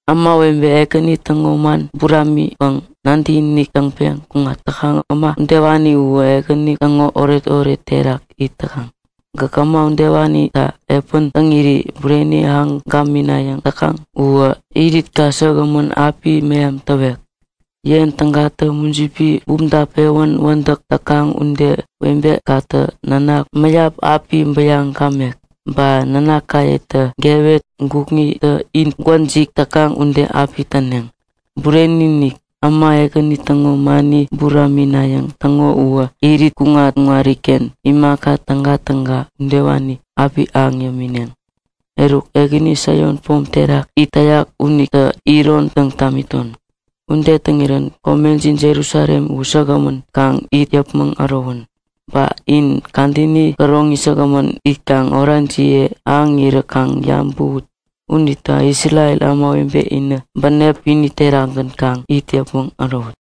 Ämawebe Ekäni täŋo man buramiŋpäŋ nadäkinik täŋpeŋ kuŋat täkaŋ äma udewani uwä Ekäni täŋo oretoret terak it täkaŋ. Gäk äma udewanitä epän täŋiri bureni ahäŋ gaminayäŋ täkaŋ uwä iritka säkgämän api meham täwek. Yen tägatä mujipi bumta pewän wädäk täkaŋ ude webekatä nanak mäyap api bäyaŋ gamek. Ba nanakayetä gewet gukŋitä it gwäjik täkaŋ ude api täneŋ. Bureni-inik, äma Ekäni täŋo mani buraminayäŋ täŋo uwä irit kuŋat-kuŋariken imaka tägatäga udewani api ahäŋ yämineŋ. Eruk, Ekäni Saion pom terak it täyak unitä iron täŋ tamiton. Ude täŋirän komejin Jerusalem uwä säkgämän kaŋ it yäpmäŋ ärowän. Ba in kadäni käroŋi säkgämän itkaŋ orajiye ahäŋirä kaŋ yabäwut. Unita Isrel ämawebe inä bänep kwini terakgän kaŋ it yäpmäŋ ärowut.